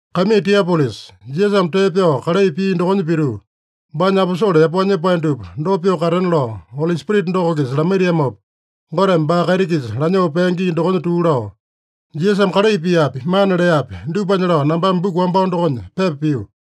Kaimii Tiopilusa, Jisasame tee pyao kalai pia dokonya pituu, baanya aposole yapao nyepae dupa dopa pyoo katena lao Oli Spirita doko-kisa lamaitiamopa Goteme baa kaiti-kisa lanyoo pea gii dokonya tuu lao, Jisasame kalai piapi, mana leapi, dupanya lao nambame buku wambao dokonya pepa pio.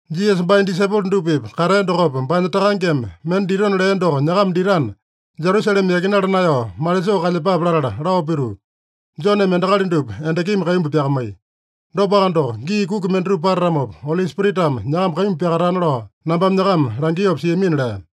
Jisasa baanya disaipolo dupa-pipa katea dokopa, baanya Takangeme mende ditona lea doko nyakama ditana, Jerusalema yakinala naeyao malisoo kalyepape latala lao pituu, “Joneme endakali dupa endakimi kaimbu pyakamaiya. Dopaka doko, gii kuki mendatupa patatamopa, Oli Spiritame nyakama kaimbu pyakatana lao nambame nyakama langiopa siamina” lea.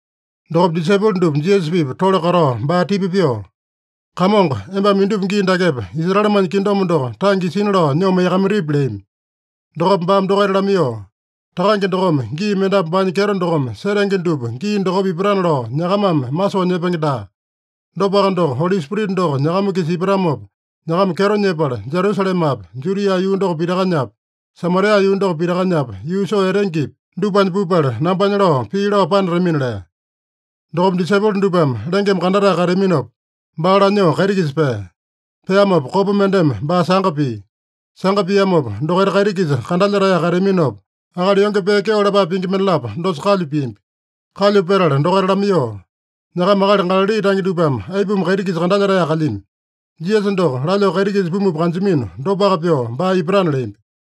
Dokopa disaipolo dupa Jisasa-pipa tole katao baa tipa pyoo, “Kamongo, embame indupa gii dakepa, Israelemanya kingdom doko tange isina lao nyoo maiyakamaitipi?” leami. Dokopa baame dokaita lamaiyoo, “Takange dokome gii mendapu baanya kyeto dokome setenge dupa gii dokopa ipatana lao nyakamame masoo nyepenge daa. Dopaka doko, Oli Spirita doko nyakama-kisa ipatamopa nyakama kyeto nyepala, Jerusalemapi, Judia yuu doko pitakanyapi, Samaria yuu doko pitakanyapi, yuu soo etengepi, dupanya pupala, nambanya lao pii lao panatamina” lea. Dokopa disaipolo dupame lengeme kandatae kateaminopa, baa lanyoo kaiti-kisa pea. Peamopa kopa mendeme baa sanga pia. Sanga piamopa, dokaita kaiti-kisa kandalyetaeyaka kateaminopa, akali yonge pee kyeo lapae pingi mendalapo dosa kalyu piambi. Kalyu petala dokaita lamaiyoo, “Nyakama akali Galali tange dupame aipuma kaiti-kisa kandalyetaeyaka kalyami? Jisasa doko lanyoo kaiti-kisa pumupa kanjamino, dopaka pyoo baa ipatana” leambi.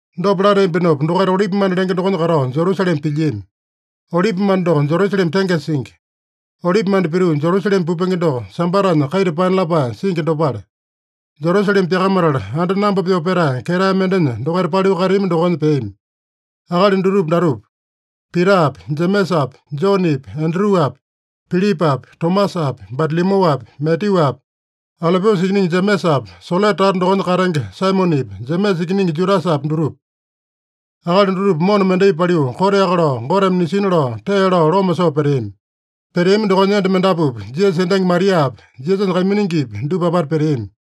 Dopa lateambinopa dokaita Olipimanda lenge dokonya katao Jerusalema pilyiami. Olipimanda doko Jerusalema tengesa singi. Olipimanda pituu Jerusalema pupenge doko, Sambatanya kaita paena lapae singi dopale. Jerusalema pyakamatala anda namba pyoo petae ketae mendenya dokaita paliu kateami dokonya peami. Akali dutupa datupa: Pitapi, Jemesapi, Jonepi, Andruapi, Pilipapi, Tomasapi, Batalomyuapi, Matyuapi, Alopiusa ikiningi Jemesapi, Selote tata dokonya katenge Saimonepi, Jemesa ikiningi Judasapi, dutupa. Akali dutupa mona mendai paliu, koteaka lao Goteme nisina lao tee lao loma soo peteami. Peteami dokonya enda mendapupi, Jisasa endangi Mariapi, Jisasanya kaiminingipi, dupa apata peteami.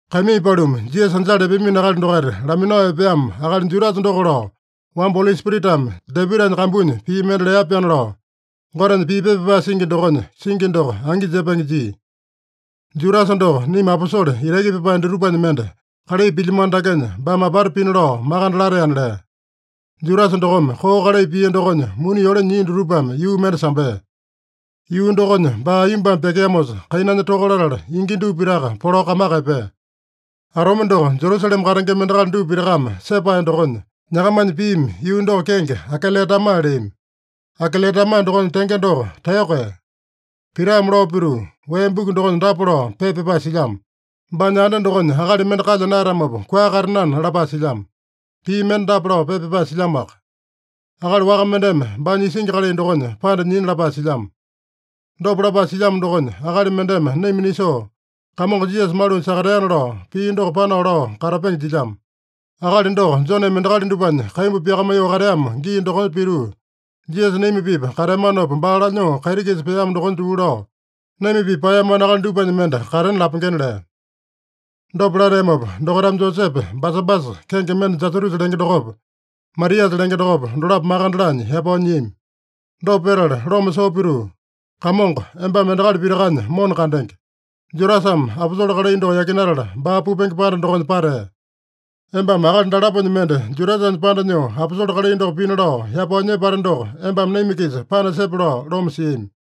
“Kaimii paluma, Jisasa anjala epeamino akali dokaita laminao epeamo akali Judasa doko lao, wamba Oli Spiritame Dapitanya kambunya pii mende lea-pyaana lao, Gotenya pii pepa pyapae singi dokonya singi doko angi jepenge jia. Judasa doko naima aposole itaki pyapae dutupanya mende, kalai pilyamano dakenya baame apata pina lao makande lateana” lea. (Judasa dokome koo kalai pia dokonya muni yole nyia dutupame yuu mende sambea. Yuu dokonya baa aiyombame pyakeamosa, kainanya toka latala, ingi dupa pitaka polao kamaka epea. Atome doko Jerusalema katengema endakali dupa pitakame sepae dokonya, nyakamanya piimi yuu doko kenge Akeledama leami. Akeledama dokonya tenge doko Taeyoko Ee.) Pitame lao pituu, “Wee Buku dokonya dapa lao pepa pyapae silyamo: ‘Baanya anda dokonya akali mende kalya naeyatamopa, kua katenana’ lapae silyamo. Pii mende dapa lao pepa pyapae silyamoaka: ‘Akali waka mendeme baanya isingi kalai dokonya panda nyina’ lapae silyamo. Dopa lapae silyamo dokonya, akali mendeme naima nisoo, Kamongo Jisasa malunya sakateana lao pii doko panao lao katapenge jilyamo. Akali doko, Joneme endakali dupanya kaimbu pyakamaiyoo kateamo gii dokonya pituu, Jisasa naima-pipa kateamanopa baa lanyoo kaiti-kisa peamo dokonya tuu lao, naima-pipa paeyamano akali dupanya mende katena lapengena” lea. Dopa lateamopa dokaitame Josepe Basabasa, kenge mende Jasatusa lenge dokopa, Matiasa lenge dokopa, dolapo makande laanya yapao nyiami. Dopa petala loma soo pituu, “Kamongo, embame endakali pitakanya mona kandenge. Judasame aposole kalai doko yakinatala, baa pupenge panda dokonya patea. Embame akali dalaponya mende Judasanya panda nyoo aposole kalai doko pina lao yapao nyepate doko embame naima-kisa panasepe” lao loma siami.